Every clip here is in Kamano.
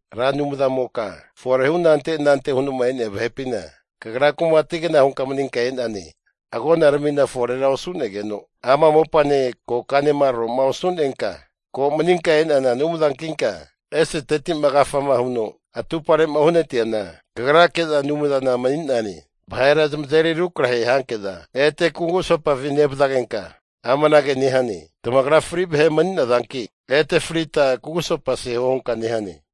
Ra Anumzamoka fore hu anante anante huno'ma e'nea vahepina, kagra kumati'gna hunka maninka e'nane. Agonaramina forera osu'negeno, ama mopane kokanema tro'ma osu'nenka, ko maninka e'nana Anumzankinka eseteti'ma agafama huno atupare'ma uhanati'neana Kagrake'za Anumzana mani'nane. Vahera zamazeri rukrahe hanke'za ete kugusopafi nevazagenka amanage nehane, tamagra fri vahe mani'nazanki, ete frita kugusopa seho hunka nehane.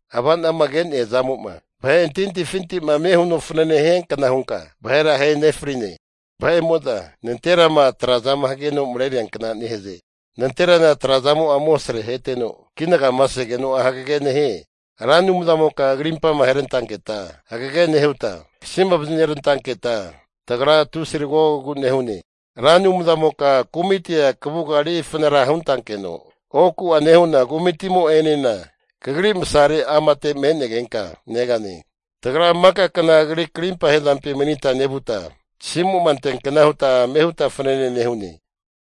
Avanama ke'nea zamo'ma vahe antahintahifinti'ma ame huno fanane hiankna hunka vahera ahe nefrine. Vahe'mo'za nanterama trazama hageno mareriankna nehaze. Nanterana tra'zamo'a amosrea aheteno, kinagama segeno'a hagege nehie. Ra Anumzamoka krimpama aherantanketa hagege nehuta, kasima vazinerantanketa, tagra tusi tagogogu nehune. Ra Anumzamoka kumitia kavuga eri fanara huntankeno, oku'a nehu'na kumitimo'enena kagri masare amate me'negenka negane. Tagra maka kna kagri krimpa hezampi manita nevuta, tasimu'ma anteankna huta ame huta fanane nehune.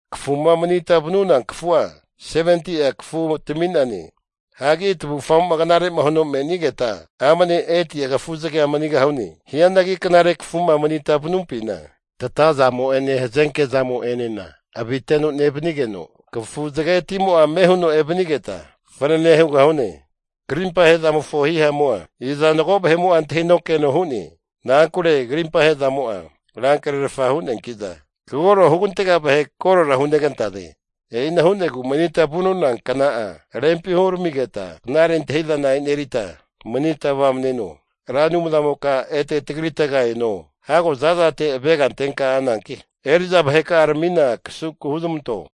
Kafuma manita vanuna kafua, 70'a kafu tami'nane. Hanki tavufgamo'ma knare'ma huno me'nigeta, amne 80'a kafuzagea manigahune. Hianagi knare kafuma manita vanumpina, tatazamo'ene hazenke zamo'enena aviteno nevanigeno, kafu zagetimo'a ame huno evanigeta fanane hugahune. Krimpa ahe'zamofo hihamu'a, iza mago vahe'mo'a antahino keno hu'ne? Na'ankure krimpa ahe'zamo'a, rankrerfa hu'neanki'za kagoro hugantega vahe korora hunegantaze. E'ina hu'negu manitama vanuna kna'a rempi huramigeta knare antahi'zana enerita manita vamneno. Ra Anumzamoka ete tagritega eno. Hago zazate krimpa ahezmantenka avega antenka ananki, eri'za vaheka'aramina kasunku huzmanto.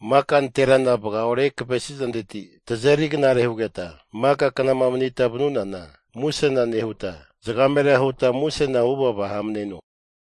Maka nanterana vagaore kavesizanteti tazeri knare hugeta, maka knama manita vanunana, musena nehuta zagamera huta musena huvava hamneno.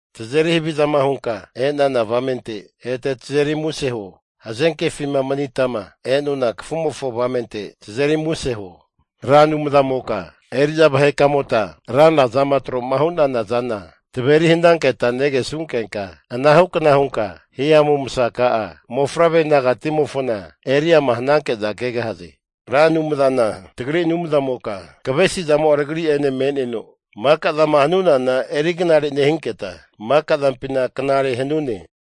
Tazeri havizama hunka e'nana avamente, ete tazeri muse huo. Hazenkefima manitama e'nona kafumofo avamente tazeri muse huo. Ra Anumzamoka eri'za vahekamota ranra zama tro'ma hu'nana zana taveri hananketa negesunkenka, anahu kna hunka hihamu masaka'a mofavre nagatimofona eriama hananke'za kegahaze. Ra Anumzana tagri Anumzamoka kavesizamo'a tagri'ene me'neno, maka zama hanunana eri knare nehinketa, maka zampina knare hanune.